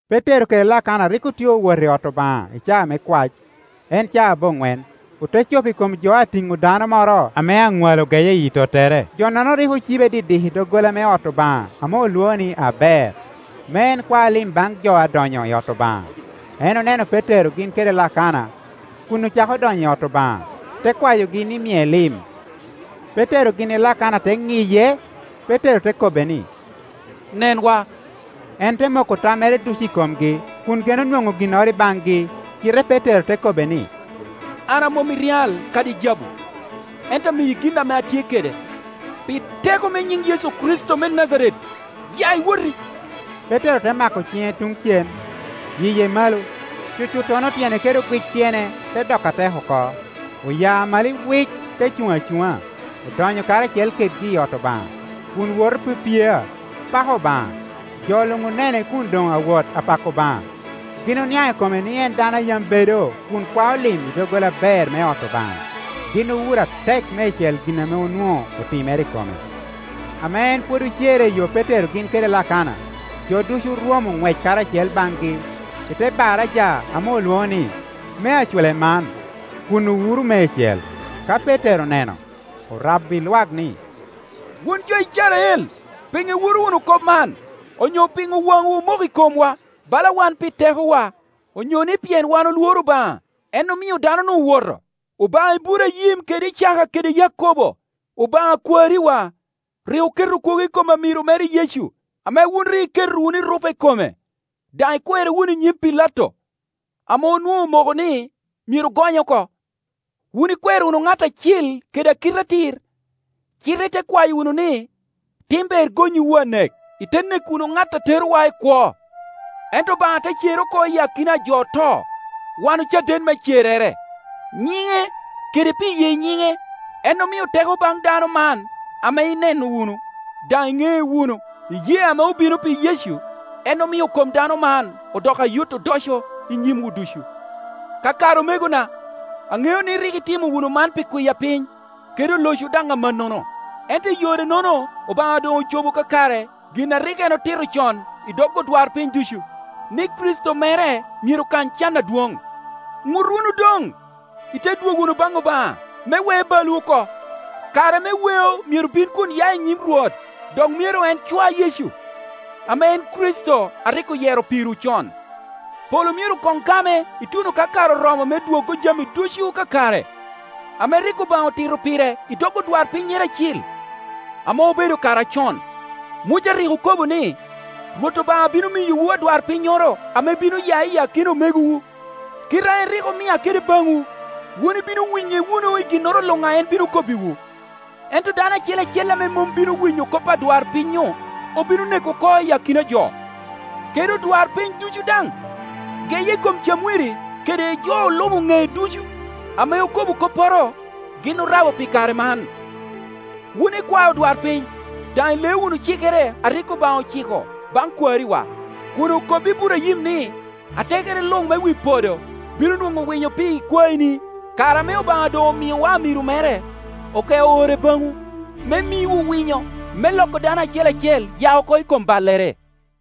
Petero kede Lakana rik otye owot i ot Obaŋa i caa me kwac, en caa aboŋwen. Ote cop i kom jo a tiŋo dano moro ame aŋwalo geye i yi tottere. Jo-nono rik ocibe didik i doggola me ot Obaŋa ame olwoŋo ni, Aber, me en kwa lim baŋ jo a donyo i ot Obaŋa. En oneno Petero gin kede Lakana kun ocako donyo i ot Obaŋa, te kwayogi ni mie lim. Petero gin i Lakana te ŋiye, Petero te kobbe ni, “Nenwa.” En te moko tammere ducu i komgi, kun geno nwoŋo ginnoro i baŋgi. Cite Petero te kobbe ni, “An a mom i ryal kadi jabu, ento amiyi gin ame atye kede. Pi teko me nyiŋ Yecu Kricito me Najaret, ya iwoti.” Petero te mako ciŋe tuŋ cem, yiye malo. Cucuttono tyene kede ogwic tyene te doko atek oko; Oya malo iwic te cuŋ acuŋa, odonyo karacel kedgi i ot Obaŋa, kun woto pyepyea, pako Obaŋa. Jo luŋ onene kun doŋ awot apako Obaŋa, gin oniaŋ i kome ni en dano a yam bedo kun kwao lim i doggola Aber me ot Obaŋa; gin owuro atek meicel gin ame onwoŋo otimere i kome. Ame en pwod ocerre i yo Petero gin kede Lakana, jo ducu orwomo ŋwec karacel baŋgi i te baraja ame olwoŋo ni, mea Culeman, kun owuro meicel. Ka Petero oneno, orabbi lwak ni, “Wun jo Icrael, piŋo iwuro wunu kop man, onyo piŋo wanwu omoko i komwa, bala wan pi tekowa, onyo ni pien wan olworo Obaŋa, en omio dano-nu owoto? Obaŋa Iburaim kede Icaka kede Yakobo, Obaŋa a kwariwa, rik oketo kwogo i kom amiro mere Yecu ame wun rik iketo wunu erupe i kome, daŋ ikwere wunu i nyim Pilato, ame onwoŋo omoko ni myero gonye oko. Wun ikwero wunu ŋat Acil kede Akite-atir, cite ite kwayo wunu ni tim ber gonnyiwu anek, ite neko wunu ŋat a terowa i kwo. Ento Obaŋa te cere oko i akina a jo oto; wan ocaden me cerrere. Nyiŋe, kede pi ye nyiŋe, en omio teko baŋ dano man ame ineno wunu, daŋ iŋee wunu; iyee ame obino pi Yecu en omio kom dano man odoko ayot odoco i nyimwu ducu. “Kakare omegona, aŋeo ni rik itimo wunu man pi kwiya piny, kede olocwu daŋ amannono. Ento i yore-nono Obaŋa doŋocobo kakare gin a rik en otito con i dog odwarpiny ducu, ni Kricito mere myero kany can adwoŋ. Ŋut wunu doŋ, ite dwogo wunu baŋ Obaŋa, me we balwu oko. Kare me weo myero bin kun ya i nyim Rwot, dok myero en cwa Yecu, ame en Kricito a rik oyero pirwu con. Polo myero koŋ game ituno ka kare oromo me dwoggo jami ducu kakare, ame rik Obaŋa otito pire i dog odwarpinnyere acil, ame obedo kare acon. Muca rik okobo ni, ‘Rwot Obaŋa bino miyowu adwarpinnyoro ame bino ya i akina omegowu, kite a en rik omia kede baŋwu. Wun ibino winye wunu i ginnoro luŋ a en bino kobbiwu. Ento dano acel acel ame mom bino winyo kop adwarpiny-nyu, obino neko oko i akina jo.’ Kede odwarpiny ducu daŋ, geye i kom Camwiri kede jo olubo ŋec ducu ame okobo kopporo, gin orabo pi kare man. Wun ikwae odwarpiny, daŋ ileo wunu cikere a rik Obaŋa ociko baŋ kwariwa, kun okobbi Iburaim ni, ‘Atekere luŋ me wi podo bino nwoŋo winyo pi ikwaeni.’ Kare ame Obaŋa doŋ omiowa amiro mere, ogeo ore baŋwu, me miwu winyo, me loko dano acel acel ya oko i kom ballere.”